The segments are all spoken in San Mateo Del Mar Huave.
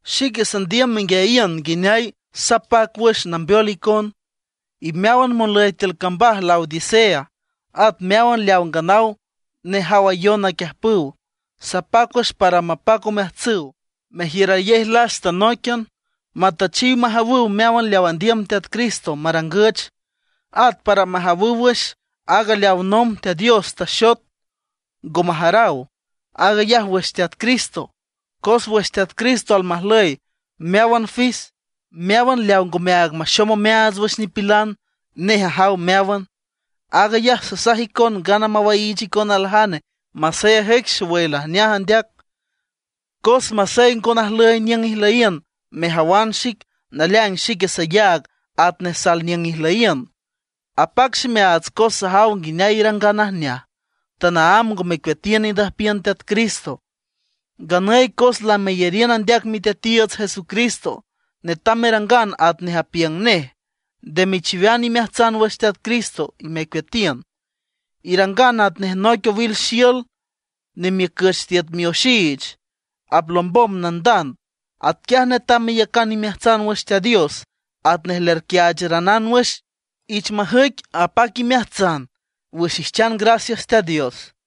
Xique sandiüm menguiayiün nguineay sapac wüx nambeol icon, y meáwan monlüy tiül cambaj Laodicea, at meáwan leaw nganaw nejawayon naquiüjpüw. Sapac wüx para mapac omeajtsüw, mejiürayej lasta nóiquian, matüchiw majawüw meáwan leaw andiüm Teat Cristo marangüch. At para majawüw wüx aaga leaw nomb Teat Dios taxot ngo majaraw; aag ayaj wüx Teat Cristo. Cos wüx Teat Cristo almajlüy meáwan fis, meáwan leaw ngomeaag maxom omeaats wüx nipilan, nej ajaw meáwan. Aag ayaj sasaj icon ngana mawaiich icon aljane masey ajüic xowüy lajneaj andeac. Cos masey ngo najlüy niüng ijlüyiün mejawan xic, naleaing xique sayaag atnej sal niüng ijlüyiün, apac ximeaats, cos sajaw nguineay irangan najneaj, tanaámb ngo mecueatiün indüjpiün Teat Cristo. Nganüy cos lameyariün andeac Miteatiiüts Jesucristo, netam merangan atnej apiüng nej. Nde mechiwean imeajtsan wüx Teat Cristo y mecueatiün. Irangan atnej noic owil xiül nemiücüch tiüt mioxiich, aplombom nandand. Atquiaj netam meyacan imeajtsan wüx Teat Dios, atnej lerquiaacharanan wüx. Ich majüic apac imeajtsan wüx ijchan gracias Teat Dios.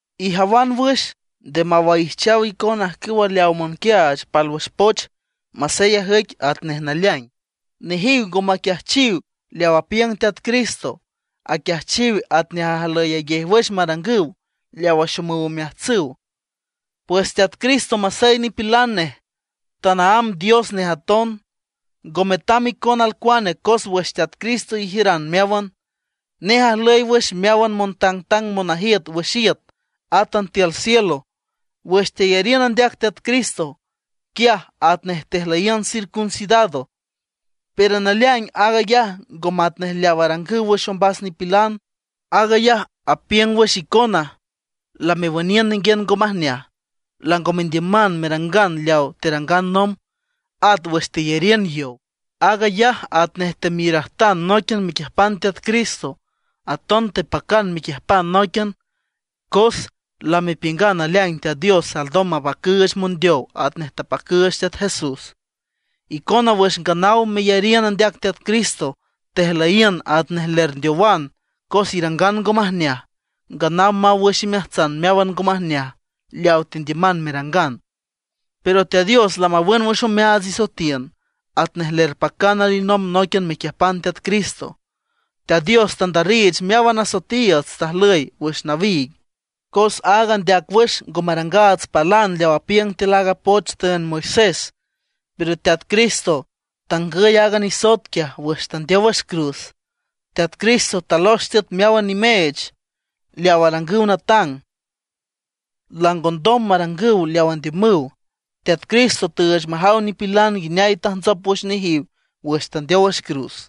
Ijawan wüx, nde mawaijchaw icon ajcüwa leaw monquiaach pálwüx poch masey ajüic atnej naleaing. Nejiw ngo maquiajchiw leaw apiüng Teat Cristo; aquiajchiw atnej ajlüyayej wüx marangüw, leawa axomüw omeajtsüw. Pues Teat Cristo masey nipilan nej, tanaámb Dios nej aton. Ngo metam icon alcuane, cos wüx Teat Cristo ijiüran meáwan. Nej ajlüy wüx meáwan montangtang monajiüt wüx iüt, átan tiül cielo. Wüx teyariün andeac Teat Cristo, quiaj atnej tejlüyiün circuncidado; pero naleaing aag ayaj ngo matnej leaw arangüw wüx ombas nipilan. Aag ayaj apiüng wüx icona lamewüniün ninguiün ngo majneaj, lango mendiüman merangan leaw terangan nomb. At wüx teyariün yow, aag ayaj atnej temiürajtan nóiquian mequiüjpan Teat Cristo. Aton tepacan mequiüjpan nóiquian, cos lamepiüngan naleaing Teat Dios alndom mapacüüch mondeow atnej tapacüüch Teat Jesús. Icona wüx nganaw meyariün andeac Teat Cristo, tejlüyiün atnej lerndeowan cos irangan ngo majneaj; nganaw maw wüx imeajtsan meáwan ngo majneaj leaw tendiüman merangan. Pero Teat Dios lamawün wüx omeaats isoetiün, atnej lerpacan alinomb nóiquian mequiüjpan Teat Cristo. Teat Dios tandarriich meáwan asoetiiüts tajlüy wüx nawiig, cos aag andeac wüx ngo marangaats palan leaw apiüng tiül aaga poch tüünd Moisés. Pero Teat Cristo tangüy aaga nisoet quiaj wüx tandeow wüx cruz. Teat Cristo talox tiüt meáwan nimeech leaw arangüw natang, langondom marangüw leaw andiümüw. Teat Cristo tüüch majaw nipilan nguineay tajntsop wüx nejiw wüx tandeow wüx cruz.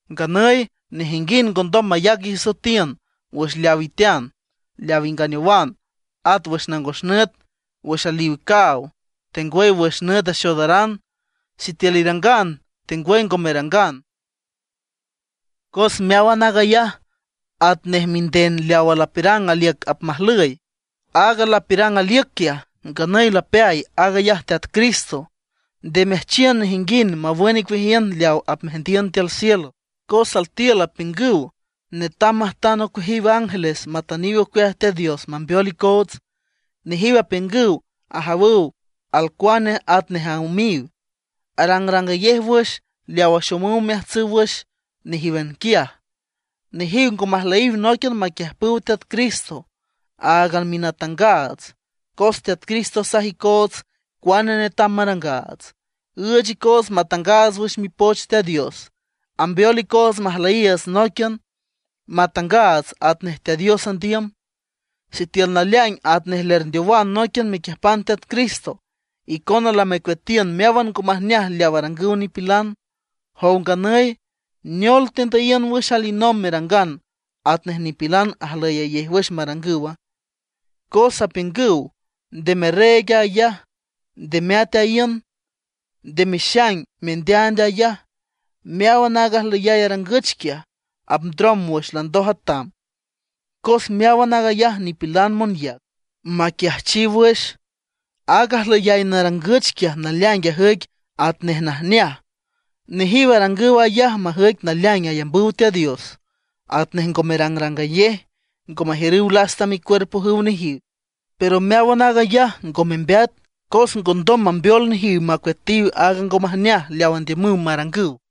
Nganüy nejinguind ngondom mayac isoetiün wüx leaw itean, leaw inganeowan; at wüx nangos nüt, wüx aliw caaw, tengwüy wüx nüt axoodaran, sitiül irangan tengwüy ngo merangan. Cos meáwan aag ayaj atnej minden leawa lapiürang aliüc apmajlüy. Aaga lapiürang aliüc quiaj nganüy lapeay; aag ayaj Teat Cristo. Nde meajchiün nejinguind mawün icueajiün leaw apmeajndiün tiül cielo, cos altiül apiüngüw netam majtan ocueajiw ángeles matüniw ocueaj Teat Dios mambeol icoots. Nejiw apiüngüw ajawüw alcuane atnej aümiw, arangrangayej wüx leaw axomüw omeajtsüw wüx nejíwan quiaj. Nejiw ngo majlüyiw nóiquian maquiüjpüw Teat Cristo, aaga minatangaats. Cos Teat Cristo asaj icoots cuane netam marangaats, üüch icoots matangaats wüx Mipoch Teat Dios, ambeol icoots majlüyiiüts nóiquian, matangaats atnej Teat Dios andiüm. Sitiül naleaing atnej lerndeowan nóiquian mequiüjpan Teat Cristo, icona lamecueatiün meáwan ngo majneaj leaw arangüw nipilan. Jow nganüy ¿neol tendüyiün wüx alinomb merangan atnej nipilan ajlüyayej wüx marangüwa? Cos apiüngüw: “Nde merreeg ayaj, nde meat aíün, nde mexaing mendeaand ayaj”. Meáwan aaga ajlüyay arangüch quiaj, apndrom wüx landoj atam, cos meáwan aag ayaj nipilan monyac, maquiajchiw wüx. Aaga ajlüyay narangüch quiaj naleaing ajüic atnej najneaj. Nejiw arangüw ayaj majüic naleaing ayambüw Teat Dios, atnej ngo merangrangayej, ngo majiürüw lasta micuerpojüw nejiw. Pero meáwan aag ayaj ngo membeat, cos ngondom mambeol nejiw macueatiw aaga ngo majneaj leaw andiümüw marangüw.